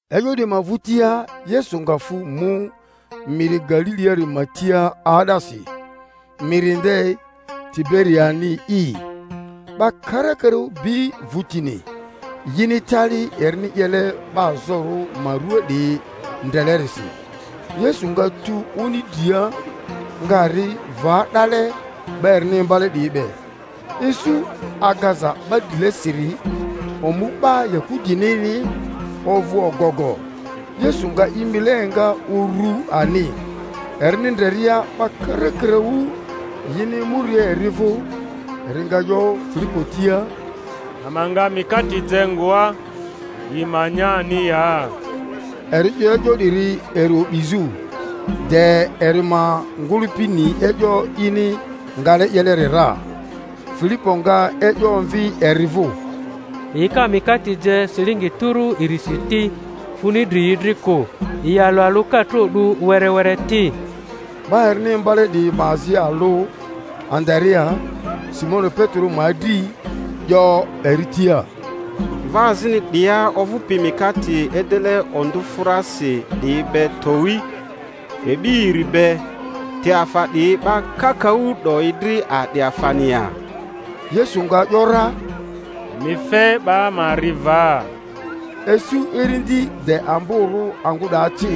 E'yo 'diyi ma vᴜtia Yesu nga fᴜ mu miri Galiliari ma tia 'aa'dasi, miri nde Tiberiani'i. 'Ba kara-karaᴜ bi vᴜtini, yini tali erini 'yele 'ba azorᴜ ma ruaa 'diyi ndrelerisi. Yesu nga tu oni dria, nga ri va 'dale 'ba erini imbale 'diyi be. Isu agaza 'ba drilesiri, omu 'ba Yahudinini, ovᴜ ogogo. Yesu nga i mile enga urᴜ ani, erini ndreria 'ba karakaraᴜ yini emuria eri vᴜ, eri nga 'yo Filipo tia, Ama nga mikate je ngoa, yi ma nya ani ya? Eri 'yo e'yo 'diri eri o'bizᴜ, de eri ma ngᴜlᴜpi ni e'yo ini ngale 'yeleri ra. Filipo nga e'yo omvi eri vᴜ, Yi ka mikate je silingi tᴜrᴜ irisi ti, funi dri yi dri kᴜ, yi alᴜ alᴜ ka tro 'du were were ti. 'Ba erini imbale 'diyi ma azi alᴜ, Andarea, Simoni Petero ma adri, 'yo eri tia, Mva azini 'dia ovᴜpi mikate edele ondᴜfᴜrasi 'diyi be towi, e'bi iri be; te afa 'diyi 'ba kakaᴜ 'doyi dri a'di afani ya? Yesu nga ‘yora, Emi fe 'ba ma ri va. Isu irindi de amborᴜ angᴜ 'daa ci.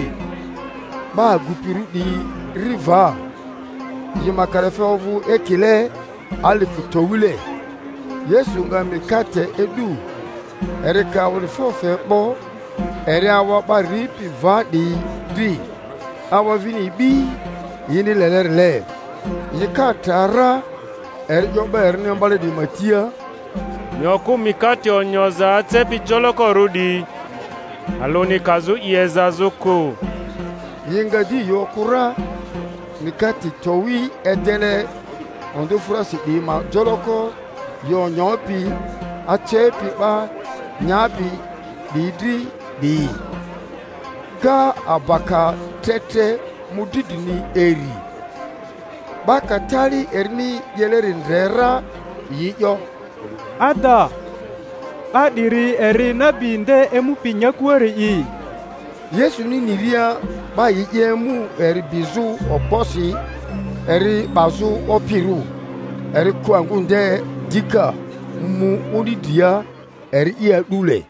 'Ba agupirᴜ 'diyi ri va, yi ma kalafe ovᴜ ekile alifᴜ towile. Yesu nga mikate e'du, eri ka awa'difo fe 'bo, eri awa 'ba ripi va 'diyi dri; awa vini e'bi, yini lelerile. Yi ka tra ra, eri 'yo 'ba erini imbale 'diyi ma tia, Emi okᴜ mikate onyoza acepi jolokorᴜ 'diyi, alᴜni kazᴜ i ezazᴜ kᴜ. Yi nga di yi okᴜ ra, mikate towi edele ondᴜfᴜrasi 'diyi ma joloko yi onyopi, acepi 'ba nyapi 'diyi dri 'diyi, ga abaka tre tre mᴜdri drini iri. 'Ba ka tali erini 'yeleri ndre ra, yi 'yo, Ada 'ba 'diri eri nabi nde emupi nyakuari'i. Yesuni niria 'ba yi 'ye emu eri bizᴜ okposi eri 'bazᴜ opirᴜ, eri kᴜ angᴜ nde dika, mu oni dria, eri'i a'dule.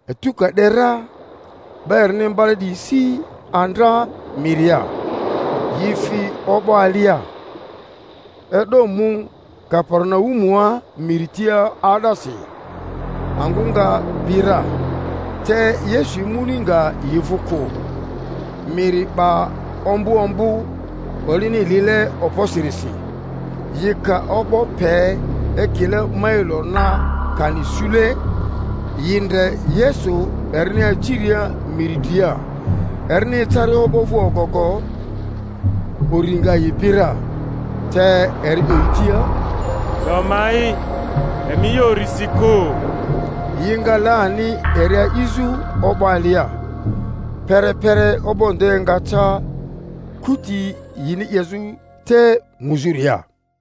Etu ka 'de ra, 'ba erini imbale 'diyi si andra miria; yi fi o'bo alia, e'do mu Kaperinaumua miri tia 'aa'dasi. Angᴜ nga bi ra, te Yesu emuni nga yi vᴜ kᴜ. Miri 'ba ombᴜ ombᴜ olini lile okposirisi. Yi ka o'bo pe ekile mailo na kani sule, yi ndre Yesu erini aciria miri dria, erini ecaria o'bo vᴜ ogogo. Uri nga yi bi ra, te eri 'yo yi tia, 'Do ma'i; emi 'ye urisi kᴜ. Yi nga le ani eri a'izᴜ o'bo alia; pere-pere o'bo nde nga ca kuti yini 'yezᴜ te muzᴜria.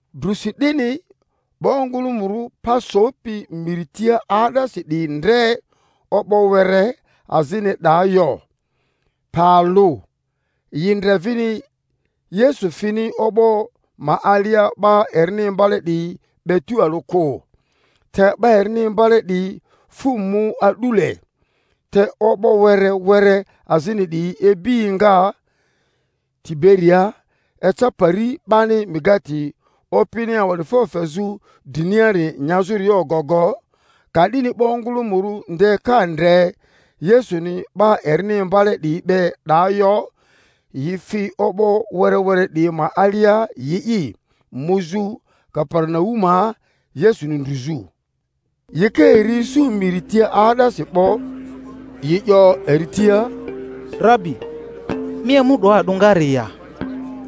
Drusi 'dini 'ba ongᴜlᴜmᴜrᴜ pa sopi miri tia 'aa'dasi 'diyi ndre o'bo were azini 'daa yo, pe alᴜ, yi ndre vini Yesu fini o'bo ma alia 'ba erini imbale 'diyi be tᴜalᴜ kᴜ, te 'ba erini imbale 'diyi fᴜ mu a'dule. Te o'bo were were azini 'diyi ibi enga Tiberiaa eca pari 'bani mikate Opini awa'difo fezᴜ driniari nyazᴜria ogogo. Ka'dini 'ba ongᴜlᴜmᴜrᴜ nde ka ndre Yesuni 'ba erini imbale 'diyi be 'daa yo, yi fi o'bo were were 'diyi ma alia yi'i, muzᴜ Kaperinaumua Yesuni ndru-zᴜ. Yi ka eri isu miri tia 'aa'dasi 'bo, yi 'yo eri tia, Rabi, mi emu 'doa a'dᴜngare ya?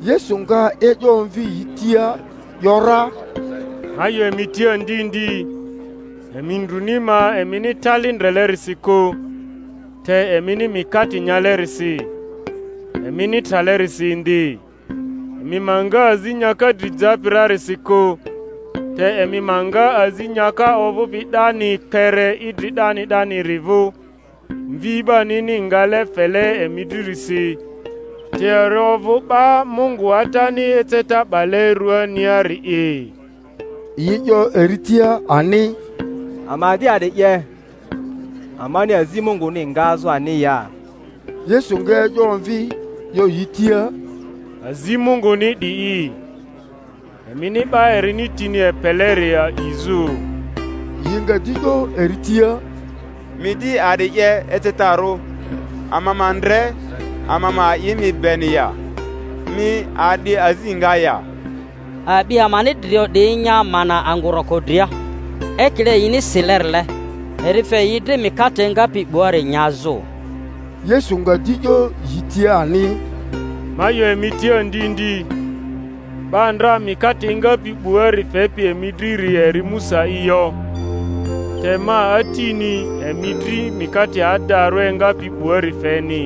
Yesu nga e'yo omvi yi tia ‘yora, Ma 'yo emi tia ndi ndi, emi ndruni ma emini tali ndrelerisi kᴜ, te emini mi-kate nyalerisi, emini tralerisi indi. Emi ma nga azi nyaka dri japi rarisi kᴜ, te emi ma nga azi nyaka ovᴜpi 'dani kpere idri 'dani 'daniri vᴜ, Mvi 'banini ngale fele emi dririsi; te eri ovᴜ 'ba Mungu Atani eceta 'bale ruaniari'i. Yi 'yo eri tia ani, Ama di a'di 'ye, ama-ni azi Munguni ngazᴜ ani ya? Yesu nga e'yo omvi, 'yo yi tia, Azi Munguni 'di'i, emini 'ba erini tini epeleri a'izᴜ. Yi nga di 'yo eri tia, Mi di a'di 'ye ecetarᴜ, ama ma ndre, ama ma a'i mi beni ya? Mi a'di azi nga ya? A'bi amani drio 'diyi nya mana angᴜ roko dria; ekile yini silerile, Eri fe yi dri mikate engapi 'buari nyazᴜ. Yesu nga di 'yo yi tia ani, Ma 'yo emi tia ndi ndi, 'ba ndra mikate engapi 'buari fepi emi driri eri Musa'i yo; te ma Atini emi dri mikate adarᴜ engapi 'buari feni.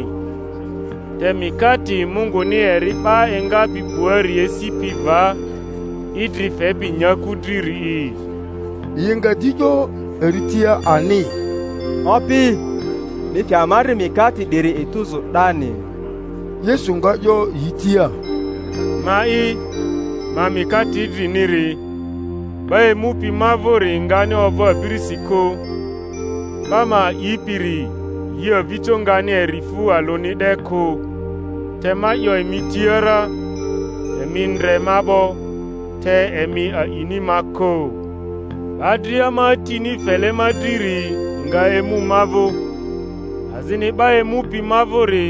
Te mikate Munguni eri 'ba engapi 'buari esipi va, idri fepi nyaku driri'i. Yi nga di 'yo eri tia ani, Opi, mi fe ama dri mikate 'diri etuzu 'dani. Yesu nga 'yo yi tia, Ma'i, ma mikate idriniri; 'ba emupi ma vᴜri ngani ovᴜ abirisi kᴜ, 'ba ma a'ipiri yi avijo ngani eri fu alᴜni 'de kᴜ. Te ma 'yo emi tia ra emi ndre ma 'bo, te emi a'ini ma kᴜ. 'Ba dria ma Atini fele ma driri nga emu ma vᴜ; azini 'ba emupi ma vᴜri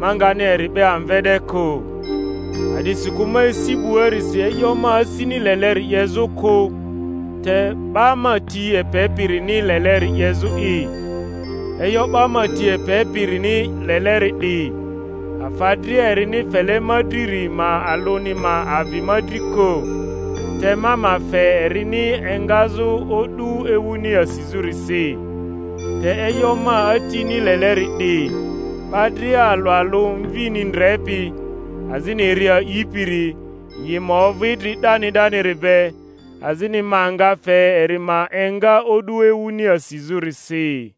ma ngani eri 'be amve 'de kᴜ. A’disikᴜ ma esi 'buarisi e'yo ma asini leleri 'yezᴜ kᴜ, te 'ba ma ti epepirini leleri 'yezᴜ'i; e'yo 'ba ma ti epepirini leleri 'di, afa dria erini fele ma driri ma alᴜni ma avi ma dri kᴜ, te ma ma fe erini engazᴜ o'du ewuni asizᴜrisi. Te e'yo ma Atini leleri 'di: 'ba dria alᴜ alᴜ Mvini ndrepi, azini eri a'ipiri, yi ma ovᴜ idri 'dani 'daniri be; azini ma nga fe eri ma enga o'du ewuni asizᴜrisi.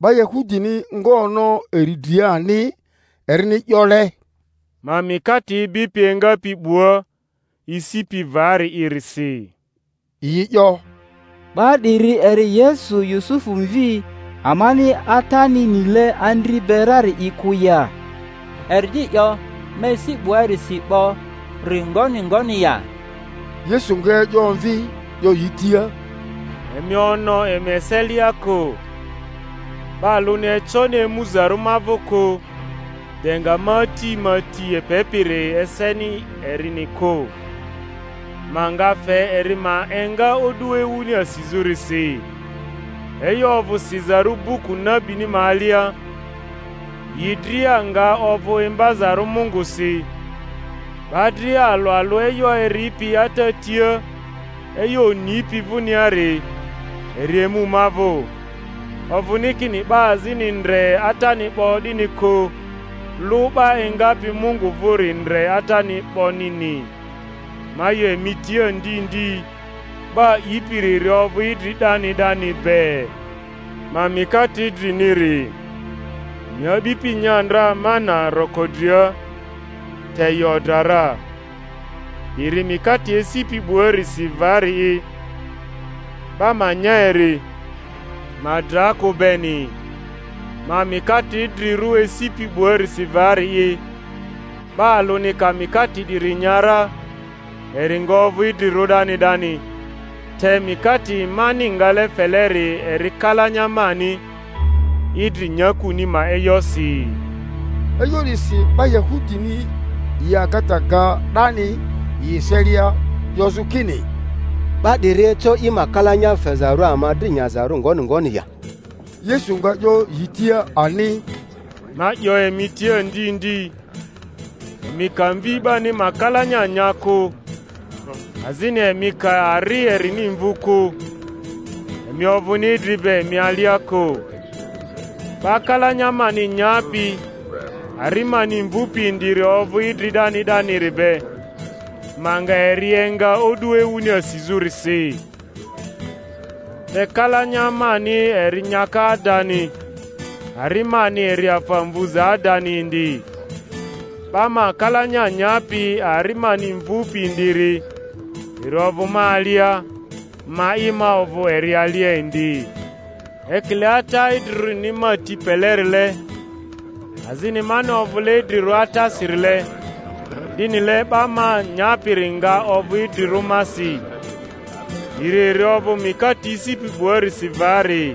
'Ba Yahudini nga ono eri dria ani, erini 'yole, Ma mikate ibipi engapi 'bua esipi vari'irisi. Yi 'yo, 'Ba 'diri eri Yesu Yusufu mvi, amani atani nile andri be rari'i kᴜ ya? Eri di 'yo, Ma esi 'buarisi 'bo-ri ngoni ngoni ya? Yesu nga e'yo omvi, 'yo yi tia, Emi ono emi eselia kᴜ. 'Ba alᴜni econi emuzarᴜ ma vᴜ kᴜ, de nga ma Ati ma ti epepiri eseni erini kᴜ; ma nga fe eri ma enga o'du ewuni asizᴜrisi. E'yo ovᴜ sizarᴜ buku nabini ma alia, Yi dria nga ovᴜ imbazarᴜ Mungusi. 'Ba dria alᴜ alᴜ e'yo eripi Ata tia, e'yo onipi vᴜniari, eri emu ma vᴜ. Ovᴜni kini 'ba azini ndre Atani 'bo 'dini kᴜ; lᴜ 'ba engapi Mungu vᴜri ndre Atani 'bonini. Ma 'yo emi tia ndi ndi, 'ba a'ipiri eri ovᴜ idri 'dani 'dani be. Ma mikate idriniri. Emi a'bipi nya ndra mana roko dria, te yi odra ra. 'Diri mikate esipi 'buarisi vari'i, 'ba ma nya eri, ma dra kᴜ beni. Ma mikate idrirᴜ esipi 'buarisi vari'i; 'ba alᴜ ka mikate 'diri nya ra, eri nga ovᴜ idrirᴜ 'dani 'dani; te mikate mani ngale feleri eri kalanya mani, idri nyakuni ma e'yosi. E'yo 'disi 'ba Yahudini yi agata ga 'dani yi eselia, 'yozᴜ kini, 'Ba 'diri eco i ma kalanya fezarᴜ ama dri nyazarᴜ ngoni ngoni ya? Yesu nga 'yo yi tia ani, Ma 'yo emi tia ndi ndi, emi ka Mvi 'bani ma kalanya nya kᴜ, azini emi ka ari erini mvu kᴜ, emi ovᴜni idri be emi alia kᴜ; 'ba kalanya mani nyapi ari mani mvᴜpi indiri ovᴜ idri 'dani 'daniri be, ma nga eri enga o'du ewuni asizᴜrisi. Tekalanya mani eri nyaka adani, ari mani eri afa mvuza adani indi. 'Ba ma kalanya nyapi ari mani mvᴜpi indiri eri ovᴜ ma alia, ma'i ma ovᴜ eri alia indi. Ekile Ata idrirᴜrini ma ti pelerile, azini mani ovᴜle idrirᴜ Atasi-rile, 'dinile 'ba ma nyapiri nga ovᴜ idrirᴜ masi. 'Diri eri ovᴜ mikate esipi 'buarisi vari,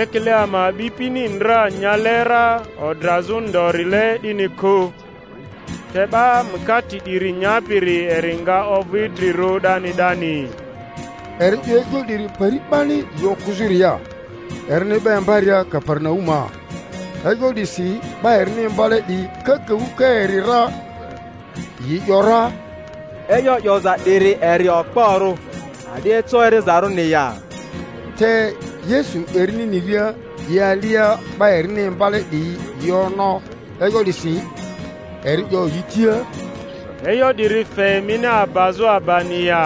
ekile ama a'bipini ndra nyale ra odrazᴜ ndorile 'dini kᴜ; te 'ba mikate 'diri nyapiri eri nga ovᴜ idrirᴜ 'dani 'dani. Eri 'yo e'yo 'diri pari 'bani yi okᴜzᴜria, erini 'ba imbaria Kaperinaumua. E'yo 'disi 'ba erini imbale 'diyi kakaᴜ ka eri ra, yi ‘yora, E'yo 'yoza 'diri eri okporᴜ; a'di eco erizarᴜni ya? Te Yesu erini niria i alia 'ba erini imbale 'diyi yi ono e'yo 'disi, eri 'yo yi tia, E'yo 'diri fe emini abazᴜ abani ya?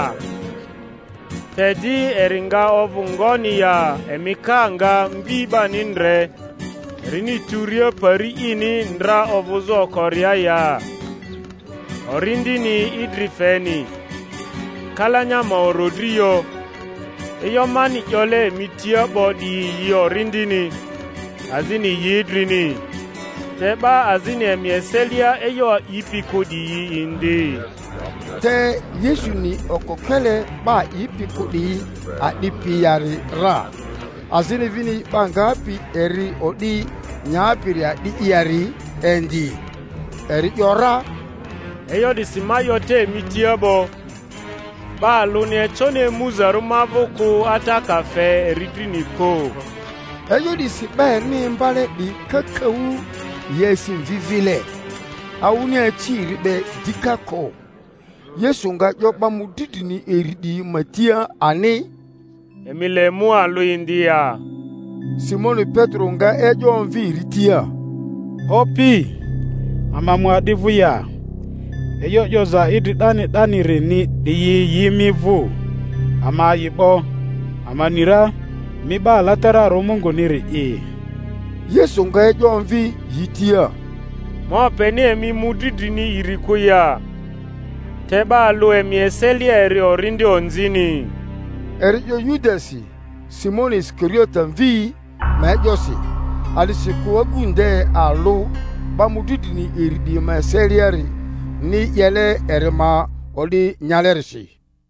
Te di eri nga ovᴜ ngoni ya emi ka nga Mvi 'bani ndre erini tᴜria pari ini ndra ovᴜzᴜ okoria ya? Orindini idri feni, kalanya ma orodri yo; e'yo mani 'yole emi tia 'bo 'diyi yi orindini, azini yi idrini. Te 'ba azini emi eselia e'yo a'ipi kᴜ 'diyi indi. Te Yesu ni okokele 'ba a'ipi kᴜ 'diyi a'dipi yari ra, azini vini 'ba ngapi eri o'di nyapiri a'di yari indi. Eri ‘yora, E'yo 'disi ma 'yo te emi tia 'bo, 'ba alᴜni econi emuzarᴜ ma vᴜ kᴜ Ata ka fe eri drini kᴜ. E'yo 'disi 'ba erini imbale 'diyi kakaᴜ yi asi mvi vile, awᴜni aci eri be dika kᴜ. Yesu nga 'yo 'ba mᴜdri drini iri 'diyi ma tia ani, Emi le mu alᴜ indi ya? Simoni Petero nga e'yo omvi eri tia, Opi, ama mu a'di vᴜ ya? E'yo 'yoza idri 'dani 'danirini 'diyi yi mi vᴜ; ama a'i 'bo, ama ni ra, mi 'Ba Alatararᴜ Munguniri’i. Yesu nga e'yo omvi yi tia, Ma openi emi mᴜdri drini iri kᴜ ya, te 'ba alᴜ emi eselia eri orindi onzini? Eri 'yo Yudasi Simoni Isikariote mvi ma e'yosi, a'disikᴜ agu nde alᴜ 'ba mᴜdri drini iri 'diyi ma eseliarini 'yele eri ma o'di nyalerisi.